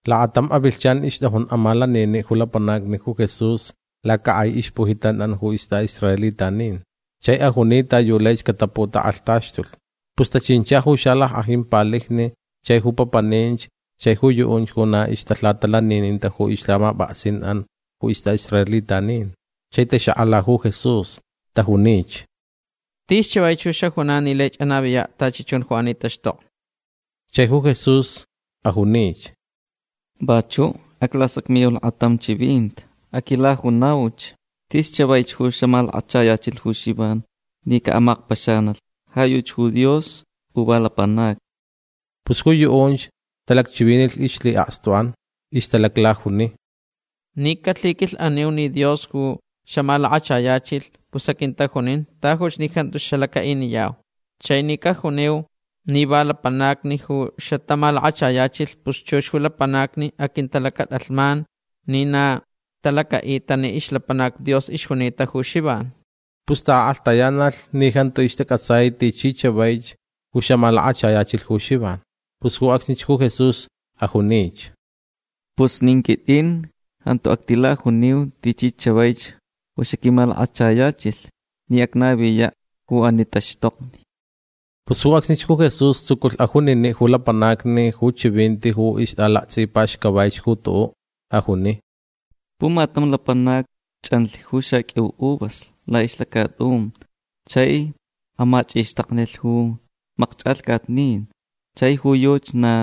Lakatam avilhchan ixtʼajun amalaniniʼ ju lapanacni ju Jesús lacakʼai ixpujitatʼan ju istʼaʼisraelitanin chai ajuni ta yu laich cataputakʼalhtaxtulh. Pus tachincha ju xalackʼajin palijni chai ju papaninch chai ju yuʼunch ju na ixtalhatalanininta ju ixlhamapʼaksinʼan ju istʼaʼisraelitanin. Chai taxakʼala ju Jesús. Tajunich: ―Tis chavaich ju xajunan ni laich anaviyaʼ tachi chun ju ani taxtokni. Chai ju Jesús ajunich: ―Vachuʼ aclasacmiyau lakatam chivinti. Aquilajunauch. Tis chavaich ju xamalakachayachilh ju Xivan ni caʼamakpaxanalh. Ja yuchi ju Dios u va lapanacni. Pus ju yuʼunch talacchivinilh ixlhiʼakstuʼan. Ixtalaclajuni: ―Ni calhiquilhʼaniu ni Dios ju xamalakachayachilh pus aquintajunin tajuch ni jantu xalacaʼiniyau. Chai ni canaju ni va lapanacni ju xatamalakachayachilh pus chux ju lapanacni aquintalacatʼalhman ni na talacaʼita ni ixlapanac Dios ixjunita ju Xivan. Pus taʼakʼalhtayanalh ni jantu ixtacʼatsai tichi chavaich ju xamalakachayachilh ju Xivan. Pus ju acsnich ju Jesús ajunich: ―Pus nin quitʼin jantu actilajuniu tichi chavaich ju xaquimalakachayachilh ni acnaviyaʼ ju ani taxtokni. Pus ju acsnich ju Jesús tsuculh ajuniniʼ ju lapanacni ju chivinti ju ixtʼalaktsʼipaxcavaich ju tuʼuʼ. Ajuni: ―Pumatam lapanac chʼanlh ju xaqʼuiu uvas laʼixlacatʼun chai amachʼixtaknilh ju makchʼalhcatnin. Chai ju yuchi na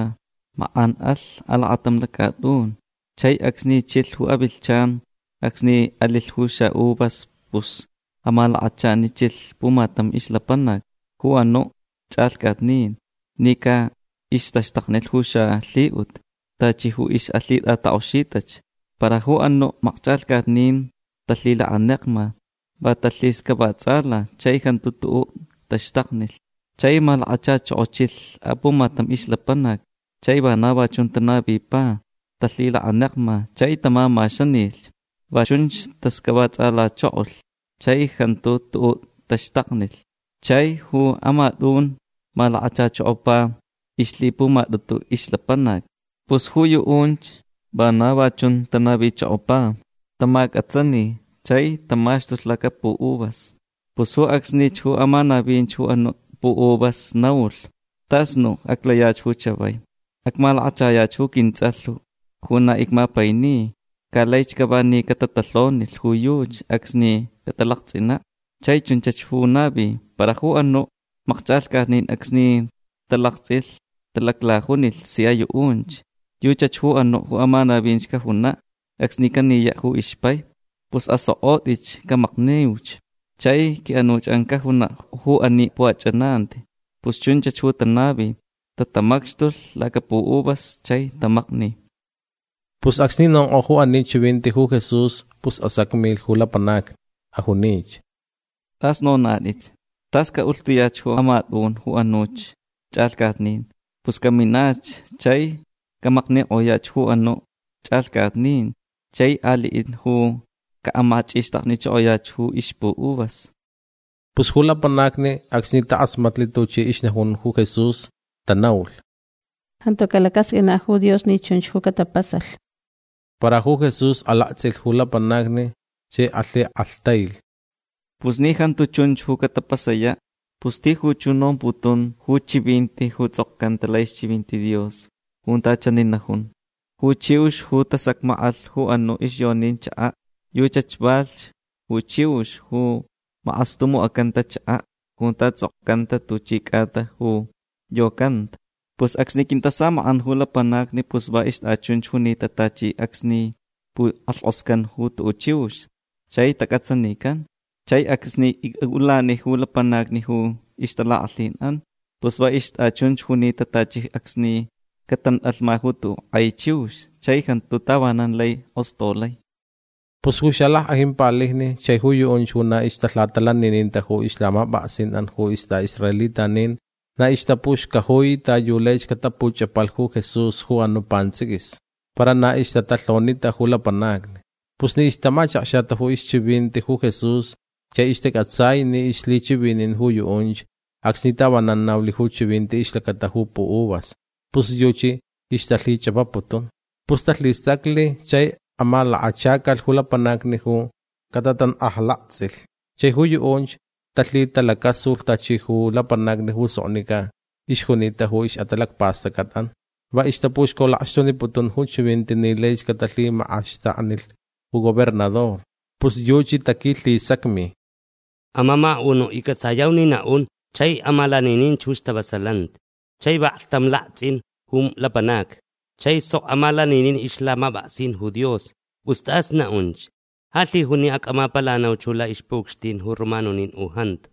makʼan alh alacatam lacatʼun. Chai acsni chilh ju avilhchan acsni alilh ju xaʼuvas pus amalakachanichilh pumatam ixlapanac ju anuʼ chʼalhcatnin ni caʼixtaxtaknilh ju xalhiʼut tachi ixʼalhitʼatakʼoxitach. Para ju anuʼ makchʼalhcatnin talhilakanekma. Va talhixcavatsʼala. Chai jantu tuʼuʼ taxtaknilh. Chai malakachachokochilh apumatam ixlapanac. Chai vana va chun tanavipa. Talhilakanekma chai tamamaxanilh. Va chunch taxcavatsʼalachokolh. Chai jantu tuʼuʼ taxtaknilh. Chai ju amatʼun malakachachokopa ixlhipumatʼutu ixlapanac. Pus ju yuʼunch vana va chun tanavichokopa. Tamacʼatsani chai tamaxtulh lacapuʼuvas. Pus ju acsnich ju amanavin ju anuʼ puʼuvas naulh: “Tas nuʼ aclayach ju chavai. Acmalakachayach ju quintsʼalh ju na icmapaini. Ca laich cava ni catatalhonilh ju yuchi acsni catalaktsʼinaʼ”. Chai chunch ju navi. Para ju anuʼ makchʼalhcatnin acsni talaktsʼilh talaclajunilh sia yuʼunch: “Yuchach ju anuʼ ju amanavinch cajunaʼ acsni caniyaʼ ju ixpai. Pus asokʼotʼitch. Camakniuch. Chai quiʼanuchʼan cajunaʼ ju ani puʼachʼananti”. Pus chunchach ju tanavi. Tatamacxtulh lacapuʼuvas chai tamakni. Pus acsni nonkʼo ju ani chivinti ju Jesús pus asacmilh ju lapanacni. Ajunich: ―Tʼas nonatʼit. Tas caʼulhtuyach ju amatʼun ju anuch chʼalhcatnin. Pus caminach chai camaknikʼoyach ju anuʼ chʼalhcatnin chai aliʼin ju caʼamachʼixtaknichokoyach ju ixpuʼuvas. Pus ju lapanacni acsni takʼasmatlh tuchi ixnajun ju Jesús tanaulh: ―Jantu calacasqʼuinaʼ ju Dios ni chunch ju catapasalh. Para ju Jesús alaktsʼilh ju lapanacni chai alhikʼalhtailh: ―Pus ni jantu chunch ju catapasayaʼ pus tijuch ju nomputun ju chivinti ju tsʼokcanta laʼixchivinti Dios junta chani najun: Ju chiux ju tasacmakʼalh ju anuʼ ixyonin chakaʼ yuchach ju valhch ju chiux ju makʼastumucʼacanta chakaʼ junta tsʼokcanta tuchi cʼata ju yocanta. Pus acsni quintasamakʼan ju lapanacni pus va ixtʼachunch junita tachi acsni pukʼalhkʼoscan ju tuʼuʼ chiux chai tacʼatsanican. Chai acsni icʼaʼulani ju lapanacni ju ixtalakʼalhinʼan pus va ixtʼachunch junita tachi acsni catantʼalhma ju tuʼuʼ kʼai chiux chai jantu tavanan lai kʼostolai. Pus ju xalackʼajin palijni chai ju yuʼunch ju na ixtalhatalanininta ju ixlhamapʼaksinʼan ju istʼaʼisraelitanin na ixtapuxcajui ta yu laich catapuchʼapalh ju Jesús ju anuʼ pantsʼiquis. Para na ixtatalhonita ju lapanacni. Pus ni ixtamachakxata ixchivinti ju Jesús chai ixtacʼatsai ni ixlhichivinin ju yuʼunch acsni tavanan naulh ju chivinti ixlacata ju puʼuvas pus yuchi ixtalhichʼapaputun. Pus talhistacli chai amalakachacalh ju lapanacni ju catatankʼajlaktsʼilh. Chai ju yuʼunch talhitalacasulh tachi ju lapanacni ju soknicʼa ixjunita ju ixʼatalacpastʼacʼatʼan. Va ixtapuxcolakxtuniputun ju chivinti ni laich catalhimakʼaxtaknilh ju gobernador. Pus yuchi taquilhisacmi: ―Amamakaʼunuʼ iccʼatsayau ni naʼun chai amalanininch ju stavasalanti. Chai vaklhtam chun alaktsʼin ju lapanacni. Chai sok amalaninin ixlhamapʼaksin ju Dios. Pus tʼas naʼunch. Ja lhijun ni acʼamapalanauch ju laʼixpuʼucxtin ju romanonin u jantu.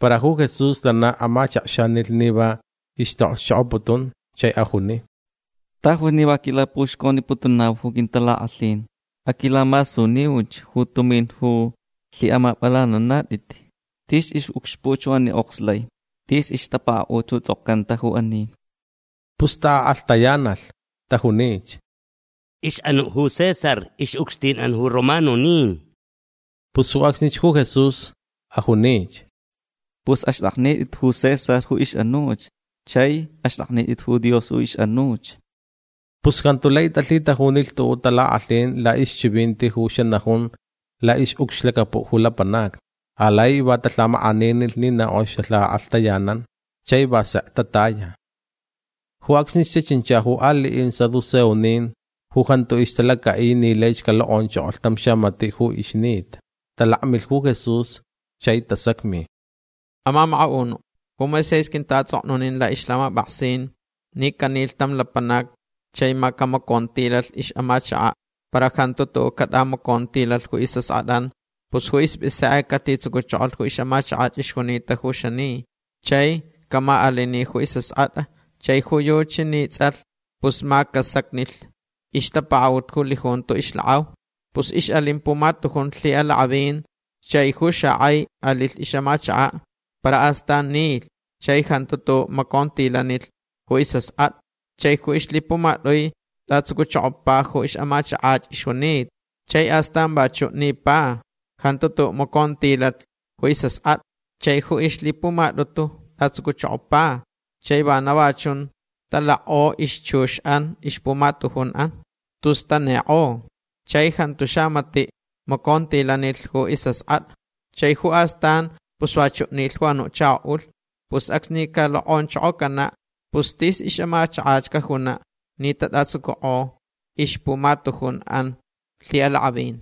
Para ju Jesús lana amachakxanilh ni va ixtaʼokxchokʼoputun chai ajuni: ―Tajuch ni va quilapuxconiputunau ju quintalakʼalhin. Aquilamasuniuch ju tumin ju lhiʼamapʼalananatʼit. Tis ixʼucxpuʼ ju ani okslai. Tis ixtapakaʼut ju tsʼokcanta ju ani. Pus taʼakʼalhtayanalh. Tajunich: ―Ixʼanuʼ ju César ixʼucxtinʼan ju romanonin. Pus ju acsnich ju Jesús ajunich: ―Pus axtʼaknitʼit ju César ju ixʼanuch. Chai axtʼaknitʼit ju Dios ju ixʼanuch. Pus jantu lai talhitajunilh tuʼuʼ talakʼalhin laʼixchivinti ju xanajun laʼixʼucxlacapuʼ ju lapanacni. Alai va talhamakʼaninilh ni na kʼox xalhakʼalhtayanan. Chai va sek tataya. Ju acsnich tachincha ju aliʼin saduceonin ju jantu ixtalacaʼi ni laich calokʼonchokolh tam xamatiʼ ju ixnita. Talakmilh ju Jesús chai tasacmi: ―Amamakaʼunuʼ ju Moisés quintaʼatsʼoknunin laʼixlhamapʼaksin ni canilh tam lapanac chai ma camacontilalh ixʼamachakaʼ para jantu tuʼuʼ catʼamacontilalh ju isʼaskʼatʼan pus ju ispʼisekʼe calhitsucuchokolh ju ixʼamachakach ixjunita ju xani. Chai camaʼalini ju isʼaskʼatʼa chai ju yuchi ni tsʼalh pus ma casacnilh ixtapakaʼut ju lijunto ixlakʼau. Pus ixʼalin pumatujun lhiʼalakʼavin. Chai ju xakʼai alilh ixʼamachakaʼ. Para astan nilh chai jantu tuʼuʼ macontilanilh ju isʼaskʼatʼa. Chai ju ixlhipumatʼui tʼatsucuchokopa ju ixʼamachakach ixjunita. Chai astan vachuʼ nipa. Jantu tuʼuʼ macontilalh ju isʼaskʼatʼa. Chai ju ixlhipumatʼutu tʼatsucuchokopa. Chai vana va chun talakʼo ixchuxʼan ixpumatujunʼan. Tus tanikʼo. Chai jantu xamatiʼ macontilanilh ju isʼaskʼatʼa. Chai ju astan pus vachuʼ nilh ju anuʼ chakoʼulh. Pus acsni calokʼonchokocanaʼ pus tis ixʼamachakach cajunaʼ ni tatʼatsucukʼo ixpumatujunʼan lhiʼalakʼavin.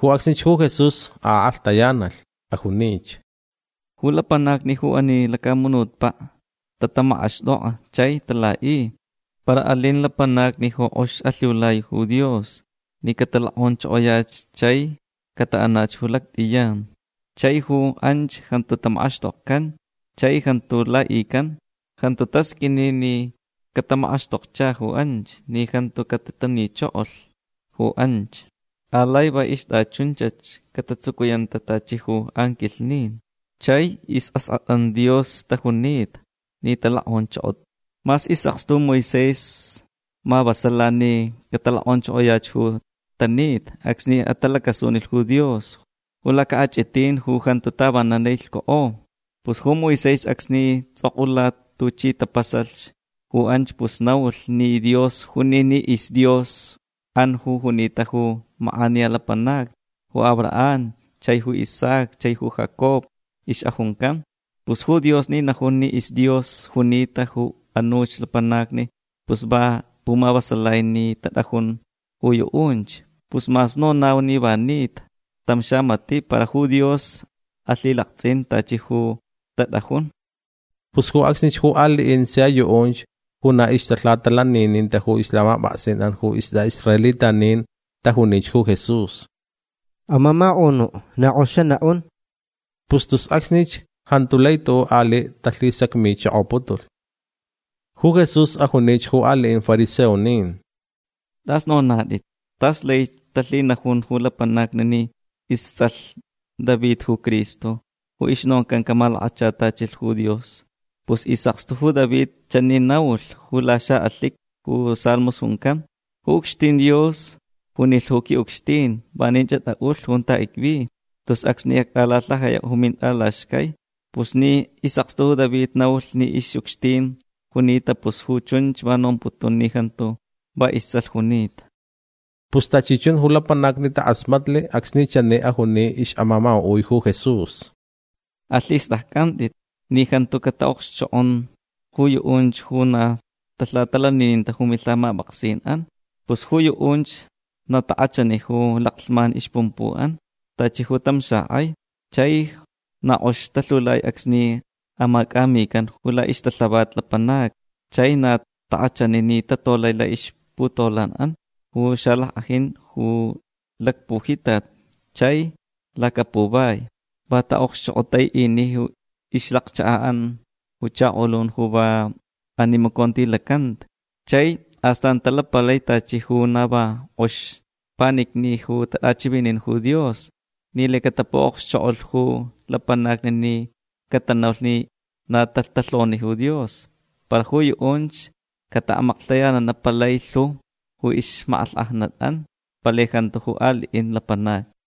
Ju acsnich ju Jesús akʼalhtayanalh. Ajunich: ―Ju lapanacni ju ani lacamunutpaʼ tatamakʼaxtʼokʼa chai talaʼi. Para alin lapanacni ju kʼox alhiulai ju Dios ni catalokʼonchokoyach chai cataʼanach ju lactʼiyan. Chai ju anch jantu tamakʼaxtokcan chai jantu laʼican. Jantu tasqʼuini ni catamakʼaxtokcha ju anch ni jantu catitanichokolh ju anch. Alai va ixtʼachunchach catatsucuyanta tachi ju anquilhnin. Chai isʼaskʼatʼan Dios tajunita ni talokʼonchokota. Mas isʼakstu ju Moisés mavasala ni catalokʼonchokoyach ju tanita acsni atalacasunilh ju Dios ju lacaʼachʼitin ju jantu tavanan lai lhcukʼo. Pus ju Moisés acsni tsʼokʼula tuchi tapasalh ju anch pus naulh ni Dios juni ni isDiosʼan junita ju makʼaniya lapanacni ju Abraham chai ju Isaac chai ju Jacob ixʼajuncan. Pus ju Dios ni najun ni isDios junita ju anuch lapanacni pus va pumavasalai ni tatʼajun ju yuʼunch. Pus mas nonau ni va nita tam xamatiʼ para ju Dios alhilaktsʼin tachi ju tatʼajun. Pus ju acsnich ju aliʼin sia yuʼunch ju na ixtalhatalanininta ju ixlhamapʼaksinʼan ju istʼaʼisraelitanin tajunich ju Jesús: ―Amamakaʼunuʼ na kʼox xanaʼun. Pus tus acsnich jantu lai tuʼuʼ aliʼ talhisacmichokoputulh. Ju Jesús ajunich ju aliʼin fariseonin: ―Tʼas nonatʼit. Tas laich talhinajun ju lapanacni ni istsʼalh David ju Cristo ju ixnoncan camalakachatachilh ju Dios. Pus isʼakstu ju David chani naulh ju laxaʼalhiqui ju Salmos juncan: Ju ucxtin Dios junilh ju quiʼucxtin: “Vanin atʼaʼulh junta icvi. Tus acsni actʼalalhajayaʼ ju mintʼalaxcai”. Pus ni isʼakstu David naulh ni ixʼucxtin junita pus ju chunch va nomputun ni jantu va istsʼalh junita. Pus tachi chun ju lapanacni takʼasmatlh acsni chani ajuni ixʼamamakaʼui ju Jesús: ―Alhistʼaccʼantʼit ni jantu cataʼokxchokʼon ju yuʼunch ju na talhatalanininta ju milhamapʼaksinʼan. Pus ju yuʼunch na takʼachani ju laclhman ixpumpuʼan tachi ju tam xakʼai. Chai na kʼox talhiulai acsni amacʼamican ju laʼixtalhavat lapanacni. Chai na takʼachani ni tatolai laʼixputolanʼan ju xalackʼajin ju lacpujitat chai lacapuvai. Va taʼokxchokʼotaiʼini ixlacchakaʼan ju chakolun ju va animacontilacanta. Chai astan talapalai tachi ju na va kʼox panicni ju tatʼachivinin ju Dios ni lai catapuʼokxchokʼolh ju lapanacni ni catanaulh ni na tatalhoni ju Dios. Para ju yuʼunch cataʼamaklhtayananaʼ palai lhu ju ixmakʼalhkʼajnatʼan. Palai jantu ju aliʼin lapanacni.